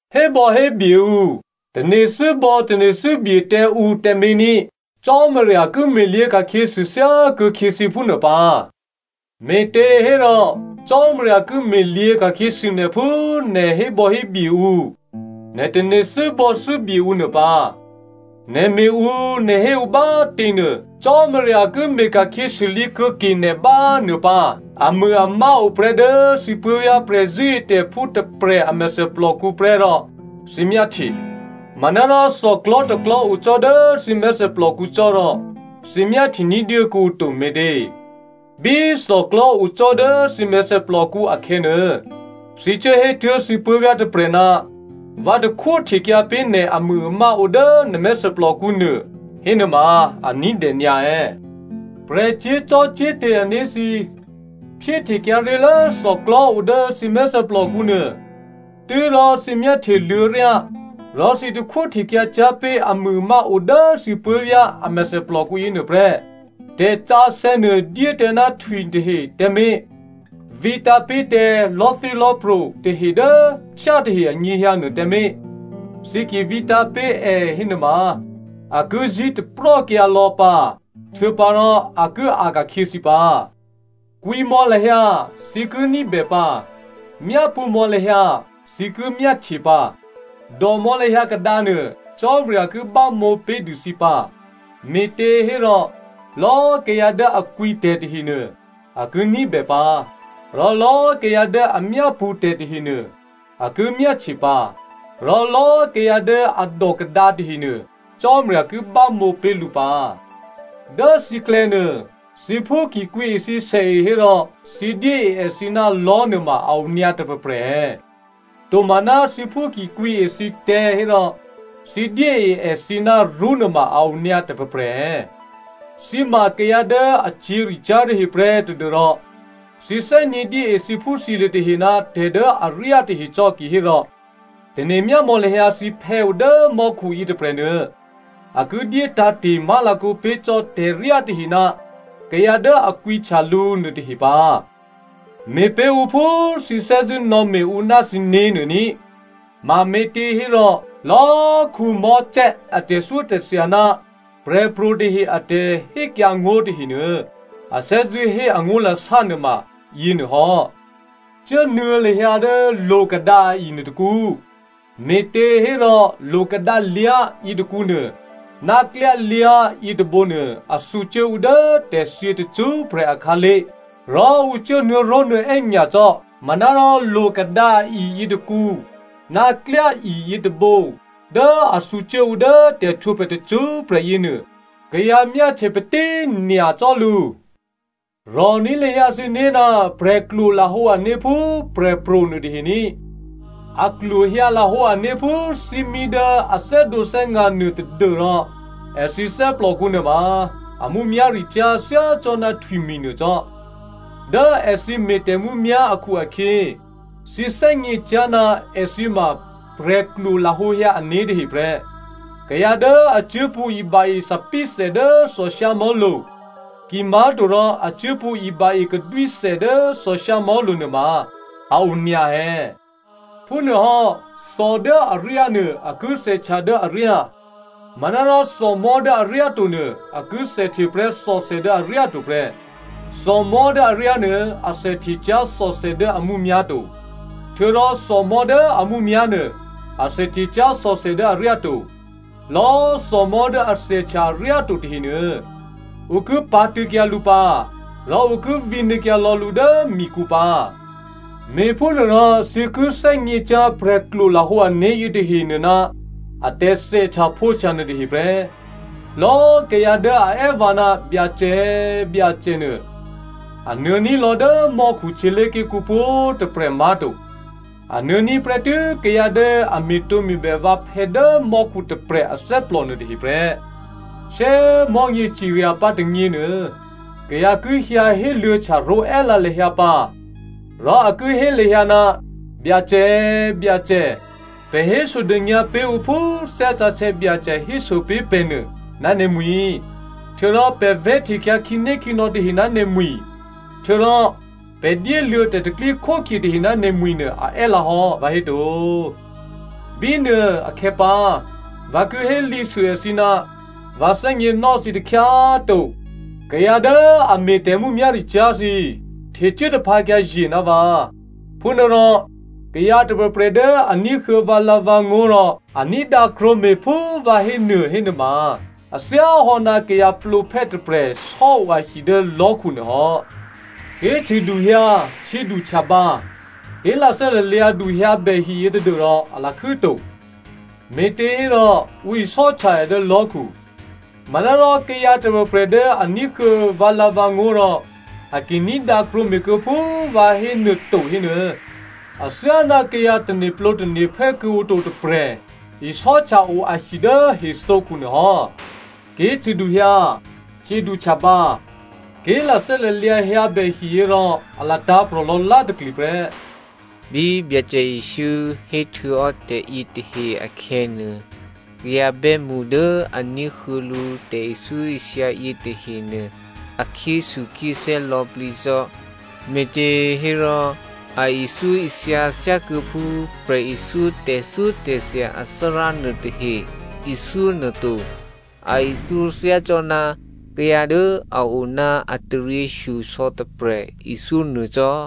“Hébò̌hébye ǔ, tane̤thû́bò̌tane̤thû́bye tǎ ǔ tǎmé̤ ní꤮. Cò́marya ki me̤lyě̤ ka̤khyěsû thyákuô̌khyě thǐ phúnuô pǎ. Me̤těhérò Cò́marya ki me̤lyě̤ ka̤khyěsû nè̤ phú nè̤ hébò̌hébye ǔ, nè̤ tane̤thû́bò̌thû́bye ǔ nuô pǎ. Nè̤ me̤ ǔ nè̤ hé ǔ bá꤮ těnuô, Cò́marya ki me̤ ka̤khyěsûlǐ kuô̌ke nè̤ bá꤮ nuô pǎ. “Amûamá oprè́ dố thǐ puố̤vyá̤ prè̤zṳ̂́etè̤phú tôprè̤ a mèthèplòkǔ prè́ rò thǐ myáhtye, manárò thòklò̤́ tôklò̤́ o cò́ dố thǐ mèthèplòkǔ cò́ rò, thǐ myáhtye ní̤dyé kuô̌ǔ to me̤tě? Bí thòklò̤́ o cò́ dố thǐ mèthèplòkǔ akhè̌nuô, thǐ cuốhétuố̤ thǐ puố̤vyá̤ tôprè̤, ‘Vǎ takhwó htekyǎ pé̤ nè̤ amûamá odố nè̤ mèthèplòkǔ nuô,’ hénuôma, a ní̤dè nyǎ è̌? Prè̤ cyé̤zò́cò́te̤ ané̤ thǐ꤮ phyéhtekyǎ ré̤lố thòklò̤́ o dố thǐ mèthèplòkǔ nuô, tû́rò thǐ myáhtyeluô̌ryá rò thǐ takhwó htekyǎ cyá̤ pé̤ amûamá o dố thǐ puố̤vyá̤ a mèthèplòkǔ yěnuô prè́. “Tè̤sǎsè̌ nuô dyé tǎ ná htwitahe tǎmé̤, vǐtǎ̤ pé̤ tǎ lò̤́thélò̤́pro̤ tahe dố htyátahe anyěhyǎ nuô tǎmé̤, thǐ ki vǐtǎ̤ pé̤ è hénuôma a ki zí̤taprò́kyǎ lò̌ pǎ, htuô̌pǎrò a ki a̤ ka̤khyě thǐ pǎ.” “Kwǐ mò̌ lahyǎ, thǐ ki ní̤bè pǎ! Myápṳ̌ mò̌ lahyǎ, thǐ ki myáhtye pǎ. Dòmò̌ lahyǎ kadǎnuô, Cò́marya ki bámǒ pé̤dû thǐ pǎ. Me̤těhérò lò̌꤮ kayǎ dố a kwǐtè̤ tahenuô, a ki ní̤bè pǎ, rò lò̌꤮ kayǎ dố a myápṳ̌ tè̤ tahenuô, a ki myáhtye pǎ, rò lò̌꤮ kayǎ dố a dò kadǎ tahenuô, Cò́marya ki bámǒ pé̤ lǔ pǎ. “Dố thǐklè̌nuô thǐphú ki kwǐe thǐ sèe hérò thǐ dyée èthǐ ná lò̤́ nuôma a onyǎ tôprè̤prè̤ è̌? Tomaná thǐphú ki kwǐe thǐtè̤̌ hérò thǐ dyée èthǐ ná rṳ́nuôma a onyǎ tôprè̤prè̤ è̌? Thǐ ma kayǎ dố a cyě̤ricyá̤ tahe prè́ tadû́rò thǐ thè́gně dyée thǐphúthǐlye̤ tahe ná tè̤dố aryá tahe cò́ kihérò, tane̤myámò̌ lahyǎ thǐphè̌ dố mò́khu yětôprè̤nuô, a ki dyé tǎ̤te̤ má̤lakǒ pé̤ cò́ tè̤ryá tahe ná kayǎ dố a kwǐhtya lǔ nuôtahe pǎ. Me̤pé̤ ǔ phú thǐ thè́zṳ̂́ nò̌me̤ ǔ ná thǐné̤ nuô ní꤮. Mame̤těhérò lò̌꤮ Mosè a tè̤thyótè̤thya ná prè̤pro̤ tahe a tè̤hékyǎngó̤ tahenuô, a thè́zṳ̂́ hé angó̤lasá nuôma yěnuô hò́.” “Cuốnuô̌ lahyǎ dố lo̤kadǎ a-i nuôtôkǔ, me̤těhérò lo̤kadǎlyá̤ yětôkǔnuô ná klyályá̤ yětôbǒnuô a thǔcuố ǔ dố tè̤thyě tacṳ́prè̤ akhǎlé̤ rò ǔ cuố nuô̌ró̤nuô̌è́ nyacò́. Manárò lo̤kadǎ a-i yětôkǔ ná klyái yětôbǒ dố a thǔcuố ǔ dố tè̤htwǒprè̤ tacṳ́prè̤ yěnuô kayǎ myáhtye patí꤮ nyacò́ lǔ.” “Rò̤ní̤ lahyǎ thǐné̤ ná prè̤klwo lahǒ ané̤ phú prè̤pro̤ nuôtahe ní꤮. A klwohyǎ lahǒ ané̤ phú thímí dố a thè́dǒthè́nga̤ nuô tadû́rò èthǐ athè́plòkǔ nuôma a mǔmyá̤ricyá̤ thyácò́ná htwimi̤ nuô cò́. Dố èthǐ me̤ tè̤mǔmyá̤ akhu-akhyě, thǐ thè́gně cyá̤ ná èthǐ ma prè̤klwo lahǒhyǎ ané̤ tahe prè́. Kayǎ dố a cuốpṳ̌ iba-e thòbǐthè dố thòshyámò̤́lo̤, kimá̤torò a cuốpṳ̌ iba-e kadwíthè dố thòshyámò̤́lo̤ nuôma a o nyǎ è̌? Phúnuôhò́, thò dố aryá nuô, a ki thèhtya dố aryá. Manárò thòmò̤́ dố aryáto nuô, a ki thèhteprè́ thòthè dố aryáto prè́. Thòmò̤́ dố aryá nuô, athèhte cyá̤ thòthè dố a mǔmyá̤ to. Htuô̌rò thòmò̤́ dố a mǔmyá̤ nuô, a thèhte cyá̤ thòthè dố aryáto. Lò̌꤮ thòmò̤́ dố a thèhtya aryáto tahenuô, ǔ ki pǎ̤tṳ̂̌kyǎ lǔ pǎ rò ǔ ki vǐnuô̌kyǎ lò̌ lǔ dố mikǔ pǎ. Me̤phúnuôrò thǐ ki thè́gně cyá̤ prè̤klwo lahǒ ané̤ yětahenuô ná a tè̤thèhtyaphǒhtya nuôtahe prè́.” “Lò̌꤮ kayǎ dố a è́ vǎ, ‘Byacè꤮ Byacè’ nuô, a nuô̌ ní̤lò̌ dố mò́khu htyělé̤ké̤kǔ pwǒ̤꤮ tôprè̤ má̤to. A nuô̌ní̤ prè́tû́ kayǎ dố a me̤tǒme̤bè vǎphè̌ dố mò́khu tôprè̤ athè́plò nuôtahe prè́. Shyé꤮ mò̤́nyě cirya pǎ tônyěnuô, kayǎ ki hyǎ héluô̌htya ró̤è́lǎ lahyǎ pǎ rò a ki hé lahyǎ, ‘Byacè꤮ Byacè, pè̤ hésodônyǎ pé̤ ǔ phú Thè́ Sǎsè̌ Byacè héso pé̤ pè̤ nuô ná nè̤mwi̤, htuô̌rò pè̤ vè̤́htekyǎ khǐnékhǐnò̌ tahe ná nè̤mwi̤, htuô̌rò pè̤ dyéluô̌ tè̤pro̤tè̤prya̤ tahe ná nè̤mwi̤ nuô a è́lǎ hò́, vǎhéto.’ Bínuô akhè̌pǎ vǎ ki hélǐsû èthǐ, ‘Vǎ thè́gněnò́ thǐ takhyá꤮ to. Kayǎ dố a me̤ tè̤mǔmyá̤ricyá̤ thǐ꤮ htecuố taphǎkyǎ ye̤ ná vǎ.’” “Phúnuôrò kayǎ tôprè̤prè̤ dố a ní̤huô̌ vǎlǎ̤vǎngó̤ rò a ní̤dǎ krwǒme̤ phú vǎ hé nuô hénuôma, a thyáhò́ ná kayǎ plǒphè́ tôprè̤ sò́o ahi dố lò̤́khu nuô hò́. Ké̤cṳ̂duhyǎ htyěduhtyabǎ, ké̤lathè́ lalyǎdu hyǎbè hiyě tadû́rò a lakhû́to, me̤těhérò ǔ isò́htya è dố lò̤́khu. Manárò kayǎ tôprè̤prè̤ dố a ní̤huô̌ vǎlǎ̤vǎngó̤ rò a ki ní̤dǎ krwǒme̤ kuô̌ phú vǎ hénuô to hénuô, athyáná kayǎ tane̤plǒtane̤phè́ kuô̌ǔ to tôprè̤ isò́htya-o ahi dố hethǒkhu nuô hò́. Ké̤cṳ̂duhyǎ htyěduhtyabǎ, ké̤lathè́ lalyǎ hyǎbè hiyě rò a latǎ̤prò̤ lò̌lá̤takli prè́.” Bí Byacè Jesǔ héhtuô̌hò́ tè̤yětahe akhè̌nuô, kayǎ bè́mṳ dố a ní̤huô̌ lǔ tè̤ithyóithya yětahenuô, a khyéthukhyéthè́ lò̌plǐ cò́. Me̤těhérò, a ithyóithya thyákuô̌phú prè̤ithyó tè̤thyótè̤thya athárá nuôtahe ithyó nuô to. A ithyó thyácò́ná kayǎ dố a o ná a taryěshyosò̌ tôprè̤ ithyó nuô cò́.